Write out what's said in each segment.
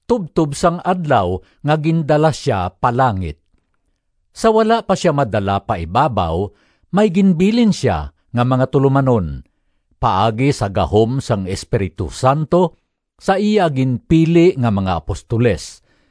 tubtob sang adlaw nga gindala sia pa langit. Sa wala pa sia madala pa ibabaw may ginbilin sia nga mga tulomanon, paagi sa gahom sang Espiritu Santo, sa iya ginpili nga mga apostoles.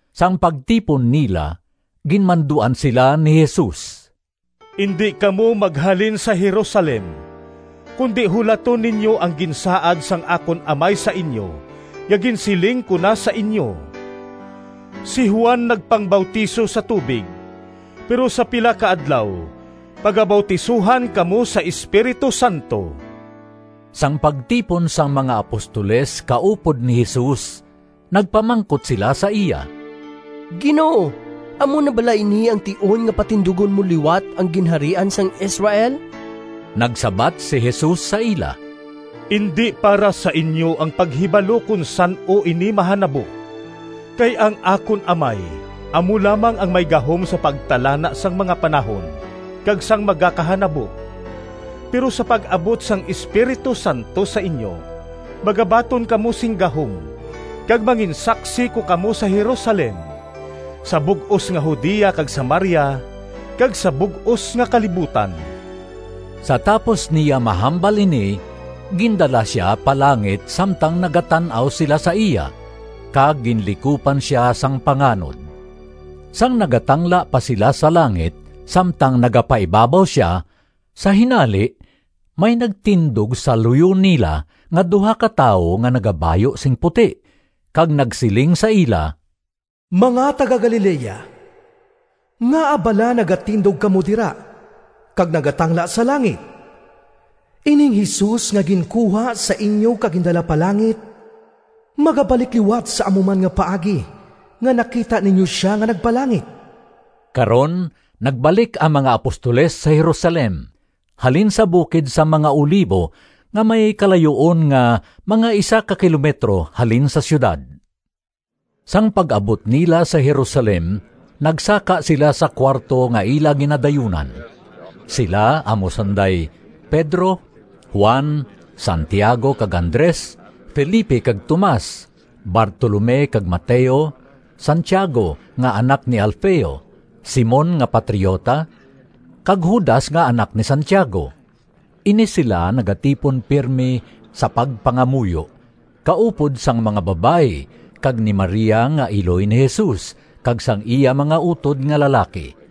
Sang pagtipon nila, ginmanduan sila ni Jesus, “Indi kamo maghalin sa Jerusalem, kundi hulaton ninyo ang ginsaad sang akon Amay sa inyo nga ginsiling ko na sa inyo. Si Juan nagpangbautiso sa tubig, pero sa pila ka adlaw pagabautisohan kamo sa Espiritu Santo.” Sang pagtipon sang mga apostoles kaupod ni Jesus nagpamangkot sila sa iya, “Ginoo, amo na bala ini ang tion nga patindugon mo liwat ang Ginharian sang Israel?” Nagsabat si Jesus sa ila, “Indi para sa inyo ang paghibalo kon san-o ini mahanabo, kay ang akon Amay amo lamang ang may gahom sa pagtalana sang mga panahon kag sang magakahanabo. Pero sa pag-abot sang Espiritu Santo sa inyo magabaton kamo sing gahom kag manginsaksi ko kamo sa Jerusalem, sa bug-os nga Judea kag Samaria, kag sa bug-os nga kalibutan.” Sa tapos niya mahambal ini gindala sia pa langit samtang nagatan-aw sila sa iya, kag ginlikupan sia sang panganod. Sang nagatangla pa sila sa langit, samtang nagapaibabaw sia, sa hinali may nagtindog sa luyo nila nga duha ka tawo nga nagabayu sing puti kag nagsiling sa ila, “Mga taga-Galilea, ngaa bala nagatindog kamo dira kag nagatangla sa langit? Ining Jesus nga ginkuha sa inyo kag gindala pa langit, magabalik liwat sa amo man nga paagi nga nakita ninyo sia nga nagpalangit.” Karon nagbalik ang mga apostoles sa Jerusalem halin sa bukid sang mga Olivo nga may kalayuon nga mga isa ka kilometro halin sa siyudad. Sang pag-abot nila sa Jerusalem nagsaka sila sa kuwarto nga ila ginadayunan. Sila amo sanday Pedro, Juan, Santiago kag Andres, Felipe kag Tomas, Bartolome kag Mateo, Santiago nga anak ni Alfeo, Simon nga patriota, kag Judas nga anak ni Santiago. Ini sila nagatipon pirme sa pagpangamuyo, kaupod sang mga babayi kag ni Maria nga iloy ni Jesus, kag sang iya mga utod nga lalaki.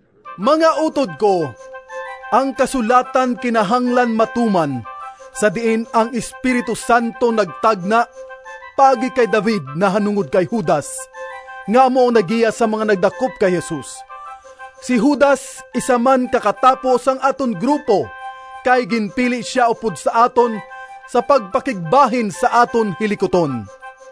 “Mga utod ko, ang kasulatan kinahanglan matuman, sa diin ang Espiritu Santo nagtagna paagi kay David nahanungod kay Judas, nga amo ang naggiya sang mga nagdakop kay Jesus. Si Judas isa man ka katapo sang aton grupo kay ginpili sia upod sa aton sa pagpakigbahin sa aton hilikuton.” (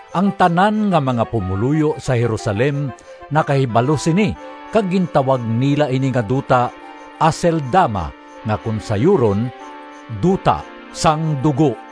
Ang tanan nga mga pumoluyo sa Jerusalem nakahibalo sini kag gintawag nila ini nga duta Aceldama nga kon sayuron, “Duta sang Dugo.”)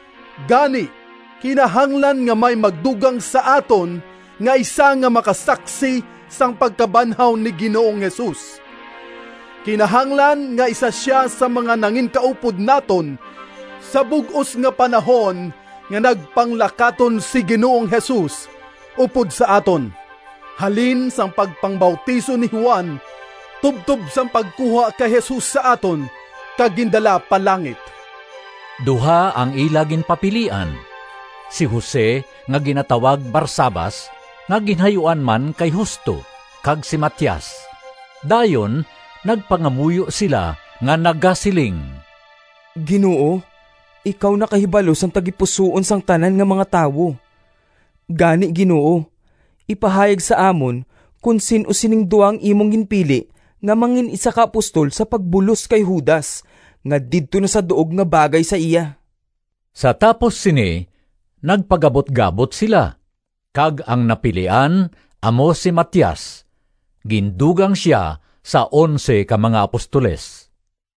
“Gani, kinahanglan nga may magdugang sa aton nga isa nga makasaksi sang pagkabanhaw ni Ginoong Jesus. Kinahanglan nga isa sia sang mga nanginkaupod naton sa bug-os nga panahon nga nagpanglakaton si Ginoong Jesus upod sa aton, halin sang pagpangbautiso ni Juan tubtob sang pagkuha kay Jesus sa aton kag gindala pa langit.” Duha ang ila ginpapilian: si Jose nga ginatawag Barsabas nga ginhayuan man kay Justo, kag si Matias. Dayon nagpangamuyo sila nga nagasiling, “Ginoo, ikaw nakahibalo sang tagipusoon sang tanan nga mga tawo. Gani, Ginoo, ipahayag sa amon kon sin-o sa sining duha ang imo ginpili nga mangin-isa ka apostol sa pagbulos kay Judas nga didto na sa duog nga bagay sa iya.” Sa tapos sini nagpagabutgabot sila, kag ang napilian amo si Matias. Gindugang sia sa onse ka mga apostoles.